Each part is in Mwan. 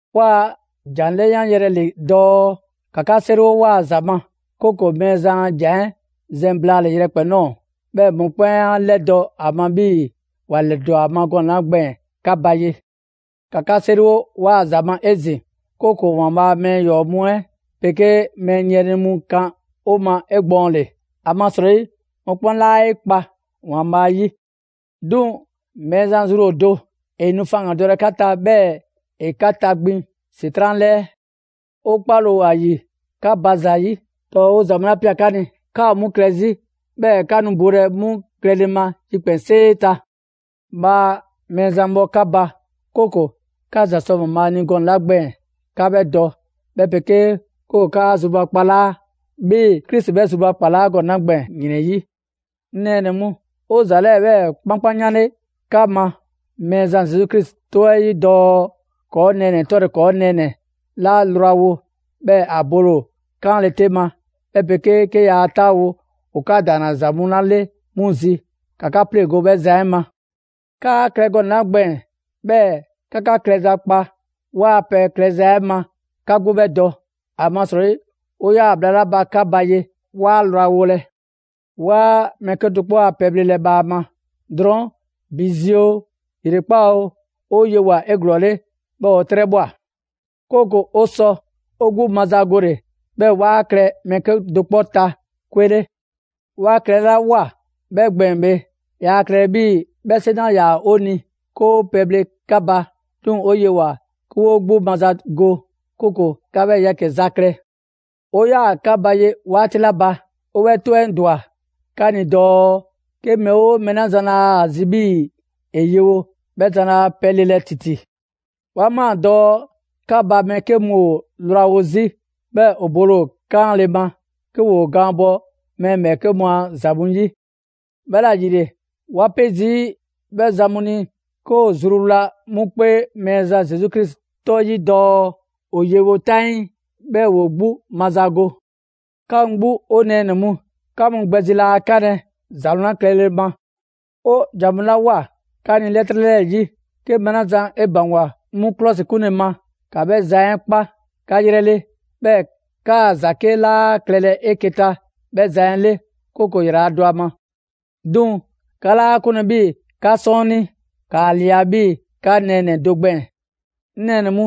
'Waa ‑jan 'lɛyanyrɛ ‑le dɔɔ ‑ka 'ka 'seriwo 'waa‑ ‑za ma, 'kooko‑ Mɛɛzan ‑a ‑jan 'ɛ zɛn blaale‑ 'yrɛkpɛn‑ ꞊nɔɔ, 'bhɛɛ‑ mɔkpɛn' 'a 'lɛdɔ‑ ‑a ma 'bhii‑ ‑wa ‑lɛdwa ‑a ma gɔnɛ‑ 'la gbɛɛn‑ 'ka ba ye. ‑Ka 'ka 'seriwo 'waa‑ ‑za ma 'ezin‑, 'kooko‑ ‑Waanbhaa' mɛɛ ‑yɔɔ' 'pegee mɛɛ yiɛnle mu kan 'o ma 'egbɔɔnle. ‑Amasrɔyi mɔkpɛn' 'laa 'e kpa ‑Waanbhaa' 'yi. 'Duŋ‑ Mɛɛzan zru ‑o do. ‑E nu faŋgandɔlɛ 'ka ta, 'bhɛɛ‑ ‑e 'ka tagbin‑ ‑Setran' 'lɛɛ. 'O 'kpale‑ ‑o ‑a ‑yi 'ka ba ‑zayi', dɔɔ 'o ‑za mu 'la ꞊pia 'ka ni, 'ka ‑o 'mu klɛ 'zi, 'bhɛɛ‑ 'ka nu bolɛ 'mu klɛlɛ ma yikpɛnsee. Bhaa Mɛɛzan bhɔ 'ka ba, 'kooko‑ 'ka ‑za sɔ ‑Waanbhaa' ni gɔnɛ‑ 'la gbɛɛn‑, 'ka 'bhɛ dɔ, 'bhɛ 'pegee, 'kooko‑ 'ka 'ka zrubakpalaa 'bhii‑ Krisi 'bhɛ zrubakpalaa gɔnɛ‑ 'la gbɛɛn‑ ‑yrɛn 'yi. 'Ŋ nɛɛnɛ‑ mu, 'o ‑za 'lɛɛ‑ 'bhɛ 'kpankpanyanle 'ka ma Mɛɛzan Zesu Krisi 'tɔ 'yi dɔɔ ‑kɔɔ' nɛɛnɛ‑ 'tɔle‑ ‑kɔɔ' nɛɛnɛ‑ 'la lrwawo, 'bhɛɛ‑ ‑a bole ‑o 'kaanle‑ 'te ma, 'bhɛ 'pegee 'ke yaa 'taawo 'o 'ka ‑daanna ‑za mu 'la 'le 'mu zi, ‑ka 'ka 'pleŋgo‑ 'bhɛ zan 'ɛ ma. 'Kaa klɛ gɔnɛ‑ 'la gbɛɛn‑ 'bhɛɛ‑ 'ka 'ka klɛza kpa 'waa pɛ klɛza 'ɛ ma, 'ka 'gbu 'bhɛ dɔ. ‑Amasrɔyi 'o 'yaa‑ bhla 'la ba 'ka ba ye, 'waa lrwawolɛ. Waa mɛɛ 'kedo‑ 'kpɔ a pɛbhlelɛ bhaama. Drɔɔn' ‑bi zi oo, ‑yrekpaa' oo, 'o yewoa꞊ 'eglɔɔle, 'bhɛɛ‑ 'o 'trɛbhwa꞊; 'kooko‑ 'o sɔ 'o 'gbu mazagole, 'bhɛɛ‑ 'waa klɛ mɛɛ 'kedo‑ 'kpɔ ta 'kwe 'le. 'Wa klɛlawoa 'bhɛ gbɛɛn‑ bhe, yaa klɛlɛ 'bhii‑ 'bhɛ 'seŋ 'laa ‑yaa 'o ni 'ke 'o pɛbhle 'ka ba. 'Duŋ‑ 'o yewoa‑ 'ke 'woo 'gbu mazago, 'kooko‑ 'ka 'bhɛɛ‑ yɛkɛ‑ za klɛ. 'O 'yaa‑ 'ka ba ye 'waati 'la ba, 'o 'bhɛ 'toŋ 'ɛ ‑dwa 'ka ni dɔɔ «'Ke mɛɛ 'o mɛɛ 'la zan laa ‑a zi 'bhii‑ ‑e yewo 'bhɛ zan laa pɛlelɛ ‑titi.» 'Wa ꞊maa dɔɔ 'ka ba mɛɛ 'ke mu ‑o lrwawo 'zi, 'bhɛɛ‑ ‑o bole ‑o 'kaanle‑ ma, 'ke ‑woo gaan bɔ mɛɛ ‑bhɛɛke' mu a ‑za mu 'yi. 'Bhɛla‑ ‑yile, 'wa 'pe zii' 'bhɛ zan mu ni, 'ke ‑o zruwla 'mu 'kpee Mɛɛzan Zesu Krisi 'tɔ 'yi dɔɔ ‑o yewo 'taŋii, 'bhɛɛ‑ ‑woo 'gbu mazago. 'Ka mu 'gbu 'o nɛɛnɛ‑ mu, 'ka mu gbɛ zi 'laa 'kanlɛ‑ ‑za 'wlan klɛle ma. 'O ‑jan mu 'la ꞊woa 'ka ni 'lɛtrɛ 'lɛɛ‑ 'yi, 'ke mɛɛ 'la zan 'e ‑baŋgwa 'mu ‑klɔsikunle ma, ‑ka 'bhɛ zan 'kpa 'ka 'yrɛ 'le, 'bhɛɛ‑ 'kaa‑ ‑za 'ke 'laa klɛlɛ 'eke‑ ta 'bhɛ zan 'ɛ 'le, 'kooko‑ ‑yraladɔ ‑a ma. 'Duŋ‑, 'ka 'laa 'kunlɛ‑ 'bhii‑ 'ka 'sɔɔnnii, ‑kaa ‑lia 'bhii‑ 'ka nɛɛnɛ‑ do gbɛɛn‑. 'Ŋ nɛɛnɛ‑ mu,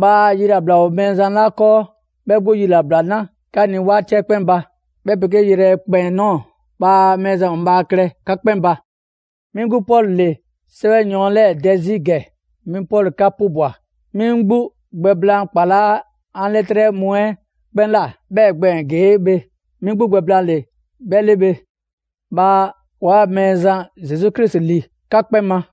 bhaa yilabla ‑o Mɛɛzan 'la 'kɔɔ, 'bhɛ 'gbu yilabla 'na 'ka ni 'waati 'ɛ 'kpɛn ba, 'bhɛ 'pegee yrɛ 'ɛ 'kpɛn ꞊nɔɔ! Bhaa Mɛɛzan ‑Waanbhaa' klɛ 'ka 'kpɛn ba! 'Mi 'gbu Pɔlu ‑le 'sɛwɛyɔɔn 'lɛɛ‑ dɛ 'zi ‑gɛ: «'Mi Pɔlu 'ka 'pubwa‑». 'Mi 'ŋ 'gbu gbɛblaan kpalaa' 'an 'lɛtrɛ mu 'ɛ 'kpɛn ꞊la 'bhɛɛ‑ gbɛɛn‑ ‑gee' bhe. 'Mi 'gbu gbɛblaan ‑le 'bhɛ 'le bhe. Bhaa ‑kɔɔa' Mɛɛzan Zesu Krisi ‑li 'ka 'kpɛn ma!